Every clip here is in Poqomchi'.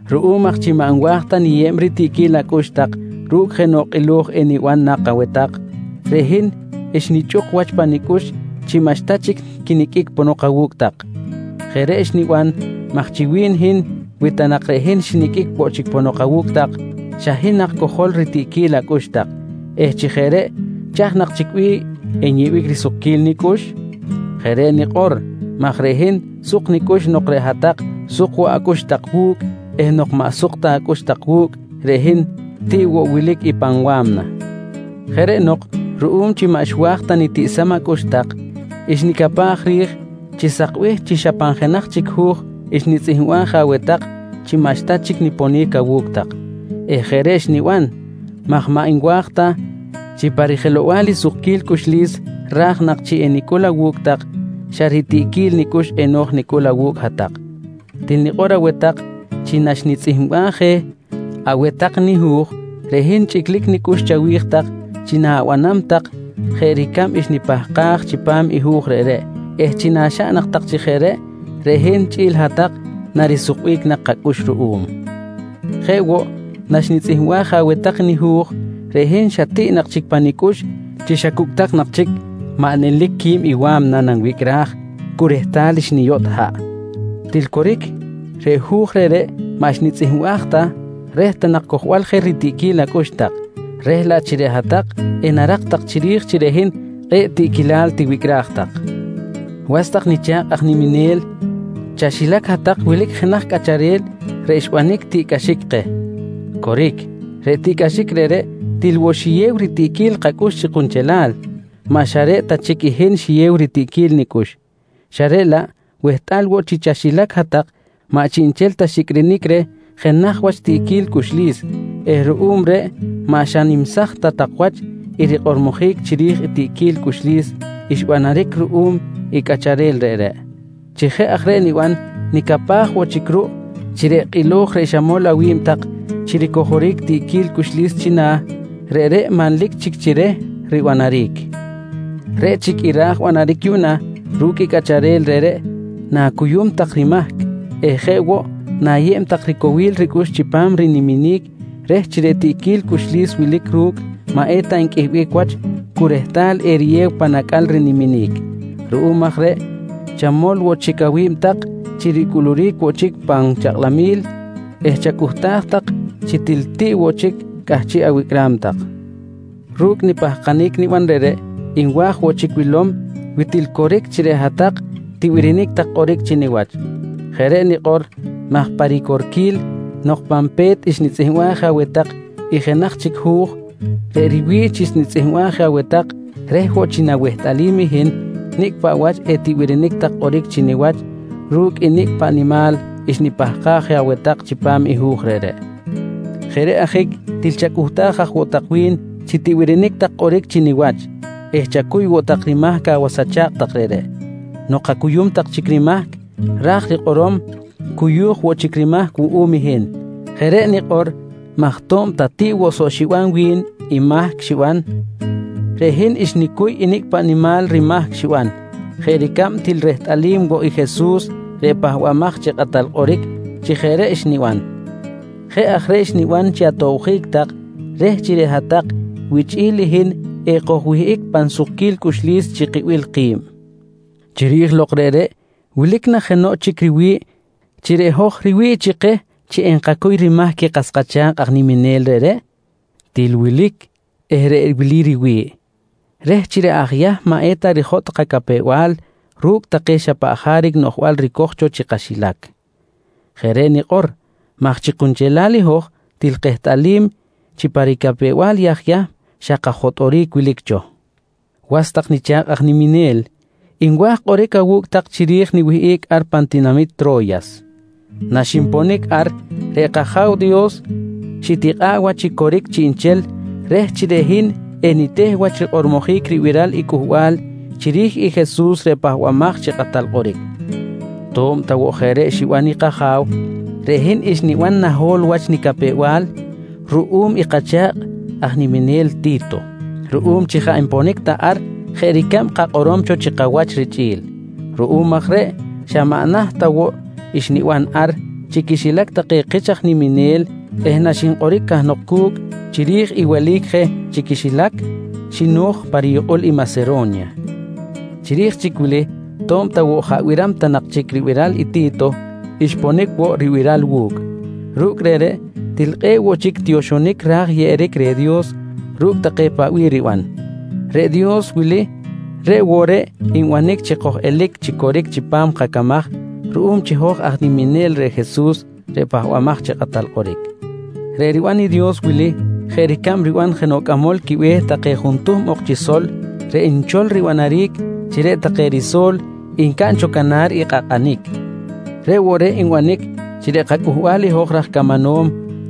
Ruꞌum aj chi maꞌ nwa̱j ta niyeb ritiꞌquil acꞌux tak ru̱cꞌ jenoꞌ kꞌilo̱j eniban nak aweh tak, reꞌ hin xnichꞌuk wach pa nicꞌux chi maꞌxta chic quiniqꞌuic ponok awu̱cꞌ tak. Jeꞌ reꞌ xniban maj chi wi̱n hin, wi ta nak reꞌ hin xiniqꞌuic woꞌ chic ponok awu̱cꞌ tak xa hin nak cojol ritiꞌquil acꞌux tak eh chi jeꞌ reꞌ chaj nak chic bih enyeꞌbic risukquil nicꞌux? Jeꞌ reꞌ nikꞌor maj reꞌ hin suk nicꞌux nok reꞌ hat-tak suk woꞌ acꞌux tak wu̱cꞌ eh nok maꞌ suk ta acꞌux tak wu̱cꞌ reꞌ hin tiꞌ woꞌ wilic i pan wa̱mna. Jeꞌ reꞌ nok ruꞌum chi maꞌ xwa̱j ta nitiꞌsam acꞌux tak, xnicapaj ri̱j chi sakbih chi xa pan jenaj chic hu̱j xnitzꞌihmbaj je aweh tak chi maꞌxta chic niponic awu̱cꞌ tak eh jeꞌ reꞌ xniban maj maꞌ nwa̱j ta chi pa rijelow-bal i sukquil cꞌuxlis raj nak chi enicꞌul awu̱cꞌ tak xa ritiꞌquil nicꞌux eno̱j nicꞌul awu̱cꞌ hat-tak. Til nikꞌor aweh tak chi naxnitzꞌihmbaj je aweh tak nihu̱j, reꞌ hin chꞌiclic nicꞌux chawi̱j tak chi na̱banam nak tak jeꞌ ricab xnipahkaj chipam i hu̱j reꞌreꞌ eh chi naxaꞌn nak tak chi jeꞌ reꞌ, reꞌ hin chꞌi̱l hat-tak narisukbic nak kacꞌux ruꞌum. Jeꞌ woꞌ, naxnitzꞌihmbaj je aweh tak i nihu̱j reꞌ hin xa tiꞌ nak chic pa nicꞌux chi xa cu̱cꞌ tak nak chic maꞌ nelic quib i wa̱mna nanwicꞌraj cu rehtal xniyotꞌ haꞌ. Til coric reꞌ hu̱j reꞌreꞌ maꞌ xnitzꞌihmbaj ta reh ta nak cojbal je ritiꞌquil acꞌux tak, reh laꞌ chi reꞌ hat-tak enarak tak chiri̱j chi reꞌ hin kꞌe̱ꞌ tiꞌquilal tiwicꞌraj tak. Was tak nicha̱kꞌ aj niminel, chaxilac hat-tak wilic jenaj cꞌacharel reꞌ xbanic tiꞌcꞌaxic keh. Coric, reꞌ tiꞌcꞌaxic reꞌreꞌ til woꞌ xiyew ritiꞌquil kacꞌux chi kunchelal, maꞌ xa reꞌ ta chic i hin xiyew ritiꞌquil nicꞌux, xa reꞌ laꞌ wehtꞌal woꞌ chi chaxilac hat-tak maꞌ chiꞌnchel ta xiꞌicꞌrinic reh jenaj wach tiꞌquil cꞌuxlis eh ruꞌum reꞌ maꞌ xa nimsaj ta tak wach i rikꞌormojic chiri̱j i tiꞌquil cꞌuxlis xbanaric ruꞌum i cꞌacharel reꞌreꞌ. Chi jeꞌ aj reꞌ niban, nicapaj woꞌ chic ruꞌ chi reꞌ kꞌilo̱j reꞌ xamol awi̱b tak chi ricojoric tiꞌquil cꞌuxlis china̱, reꞌreꞌ manlic chic chi reh ribanaric. Reꞌ chic i ra̱j banaric yuꞌna ru̱cꞌ i cꞌacharel reꞌreꞌ, na̱cuyum tak rimahc eh jeꞌ woꞌ na̱yeb tak ricowil ricꞌux chipam riniminic reh chi reꞌ tiꞌquil cꞌuxlis wilic ru̱cꞌ maꞌ eta nqꞌuihic wach cu rehtal eriyew pan acꞌal riniminic. Ruꞌum aj reꞌ chamol woꞌ tak chic awi̱b tak chi ricꞌuluric woꞌ chic pan chakꞌlamil eh chacꞌuhtaj tak chi til tiꞌ woꞌ chic cꞌahchiꞌ awicꞌram tak. Ru̱cꞌ nipahkanic niban reꞌreꞌ nwa̱j woꞌ chic wilom wi til coric chi reꞌ hat-tak tibirinic tak kꞌoric chi niwach. Jeꞌ reꞌ nikꞌor maj pa ricorquil nok pan pe̱t xnitzꞌihmbaj je aweh tak i jenaj chic hu̱j, reꞌ riwi̱ꞌ chi xnitzꞌihmbaj je aweh tak reh woꞌ chi nawehtꞌalim i hin nicꞌ paꞌ wach etibirinic tak kꞌoric chi niwach ru̱cꞌ nicꞌ paꞌ nimal xnipahkaj je aweh tak chipam i hu̱j reꞌreꞌ. Jeꞌ reꞌ ajic til chacꞌuhtaj aj woꞌ tak wi̱n chi tibirinic tak kꞌoric chi niwach eh chacuy woꞌ tak rimahc awas acha̱kꞌ tak reꞌreꞌ. Nok acuyum tak chic rimahc, ra̱j rikꞌorom cuyu̱j woꞌ chic rimahc wuꞌum hin. Jeꞌ reꞌ nikꞌor maj to̱b ta tiꞌ woꞌ soꞌ xiban wi̱n i mahc xiban, reꞌ hin xnicuy i nicꞌ paꞌ nimal rimahc xiban jeꞌ ricab til rehtꞌalim woꞌ i Jesus reꞌ Pahbamaj chi Kꞌatal Kꞌoric chi jeꞌ reꞌ xniban. Jeꞌ aj reꞌ xniban chi atobjic tak reh chi reꞌ hat-tak wichꞌi̱l i hin ekojwihꞌic pan sukquil cꞌuxlis chi kibil ki̱b. Chiri̱j lok reꞌreꞌ, wilic na jenoꞌ chic riwi̱ꞌ chi reꞌ hoj riwi̱ꞌ chi keh chi enkacuy rimahc i kas kacha̱kꞌ aj niminel reꞌreꞌ? Til wilic eh reꞌ wili riwi̱ꞌ: Reh chi reꞌ aj Yahm maꞌ eta rijotꞌ kacapew-bal ru̱cꞌ take xa paꞌ jaric noꞌjbal ricoj cho chi kaxilac. Jeꞌ reꞌ nikꞌor maj chi kunchelal i hoj til kehtꞌalim chi pa ricapew-bal i aj Yahm xa kajotꞌoric wilic cho. Was tak nicha̱kꞌ aj niminel, nwa̱j kꞌoric awu̱cꞌ tak chiri̱j niwihꞌic ar pan tinamit Tro̱yas. Naxinponic ar reꞌ kAja̱w Dios xitikꞌa̱ꞌ wach chi coric chiꞌnchel reh chi reꞌ hin eniteh wach rikꞌormojic ribiral i cꞌuhbal chiri̱j i Jesus reꞌ Pahbamaj chi Kꞌatal Kꞌoric. To̱b ta woꞌ jeꞌ reꞌ xiban i kAja̱w, reꞌ hin xniban naho̱l wach nicapew-bal ruꞌum i kacha̱kꞌ aj niminel Ti̱to, ruꞌum chi jaꞌ nponic ta ar jeꞌ ricab kakꞌorom cho chi kawach richꞌi̱l. Ruꞌum aj reꞌ xa maꞌ naht ta woꞌ xniban ar chi quixilac take kich aj niminel eh naxinkꞌoric cahnok cu̱cꞌ chiri̱j i welic je chi quixilac, xino̱j pa riyukꞌul i Masero̱nya. Chiri̱j chic wili to̱b ta woꞌ jaꞌ biram ta nak chic ribiral i Ti̱to, xponic woꞌ ribiral wu̱cꞌ. Ru̱cꞌ reꞌreꞌ til kꞌe̱ꞌ woꞌ chic tioxonic raj yeꞌeric reh Dios ru̱cꞌ take paꞌ bih riban. Reꞌ Dios wili reꞌ woꞌ reꞌ nbanic chi koj-elic chi coric chipam kacamaj ruꞌum chi hoj aj niminel reh Jesus reꞌ Pahbamaj chi Kꞌatal Kꞌoric. Reꞌ riban i Dios wili jeꞌ ricab riban jenoꞌ cꞌamol quibe̱h take juntuhm ok chi sol reꞌ nchol ribanaric chi reꞌ take riso̱l ncaꞌn cho canar i kꞌakꞌanic. Reꞌ woꞌ reꞌ nbanic chi reꞌ kacꞌuhbal i hoj raj camanom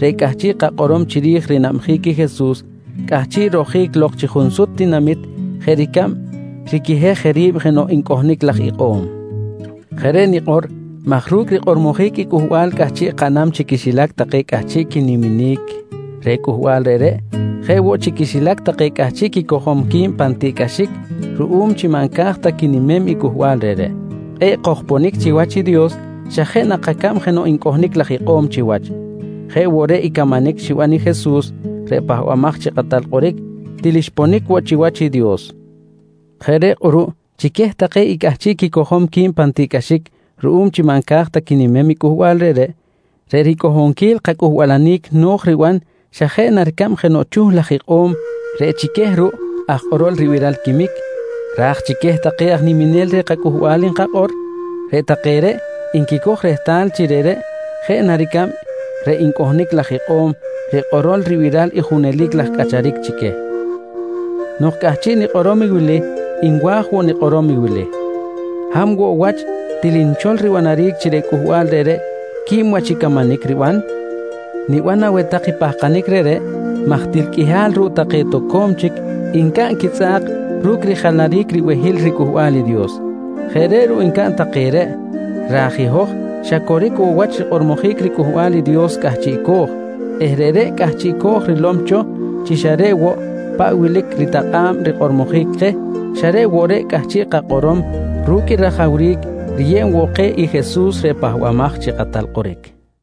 reꞌ cꞌahchiꞌ kakꞌorom chiri̱j rinabjic i Jesus cꞌahchiꞌ rojic lok chi junsut tinamit jeꞌ ricab riquihej je ri̱b jenoꞌ ncꞌohnic laj ikꞌo̱m. Jeꞌ reꞌ nikꞌor maj ru̱cꞌ rikꞌormojic i cꞌuhbal cꞌahchiꞌ kaꞌnam chi quixilac take cꞌahchiꞌ quiniminic reh cꞌuhbal reꞌreꞌ jeꞌ woꞌ chi quixilac take cꞌahchiꞌ quicojom qui̱b pan tiꞌcꞌaxic ruꞌum chi maꞌ nca̱j ta quinimem i cꞌuhbal reꞌreꞌ, kꞌe̱ꞌ kojponic chiwach i Dios xa jeꞌ na kacab jenoꞌ ncꞌohnic laj ikꞌo̱m chiwach. Jeꞌ woꞌ reꞌ i camanic xiban i Jesus reꞌ Pahbamaj chi Kꞌatal Kꞌoric til xponic woꞌ chiwach i Dios. Jeꞌ reꞌ kꞌuruꞌ chi queh take i cꞌahchiꞌ quicojom qui̱b pan tiꞌcꞌaxic ruꞌum chi maꞌ nca̱j ta quinimem i cꞌuhbal reꞌreꞌ, reꞌ ricꞌohonquil kacꞌuhbalanic no̱j riban xa jeꞌ na ricab jenoꞌ chuh laj ikꞌo̱m reꞌ chi queh ruꞌ aj kꞌorol ribiral quiquimic, ra̱j chi queh take aj niminel reh cꞌuhbal nkakꞌor, reꞌ take reꞌ nquicoj rehtal chi reꞌreꞌ jeꞌ na ricab reꞌ ncꞌohnic laj ikꞌo̱m reꞌ kꞌorol ribiral junelic laj cꞌacharic chi queh. Nok cꞌahchiꞌ nikꞌorom i wili nwa̱j woꞌ nikꞌorom i wili: Hab woꞌ wach til nchol ribanaric chi reꞌ cꞌuhbal reꞌreꞌ quib wach i camanic riban? Niban aweh tak i pahkanic reꞌreꞌ maj til qꞌuihal ruꞌ take toco̱m chic ncaꞌn quitzꞌa̱k ru̱cꞌ rijalaric ribehil riCꞌuhbal i Dios. Jeꞌ reꞌ ruꞌ ncaꞌn take reꞌ raj i hoj xa coric woꞌ wach rikꞌormojic riCꞌuhbal i Dios cꞌahchiꞌco̱j eh reꞌreꞌ cꞌahchiꞌco̱j rilom cho chi xa reꞌ woꞌ paꞌ wilic ritakꞌa̱b rikꞌormojic keh xa reꞌ woꞌ reꞌ cꞌahchiꞌ kakꞌorom ru̱cꞌ i rajawric riyeb woꞌ keh i Jesus reꞌ Pahbamaj chi Kꞌatal Kꞌoric.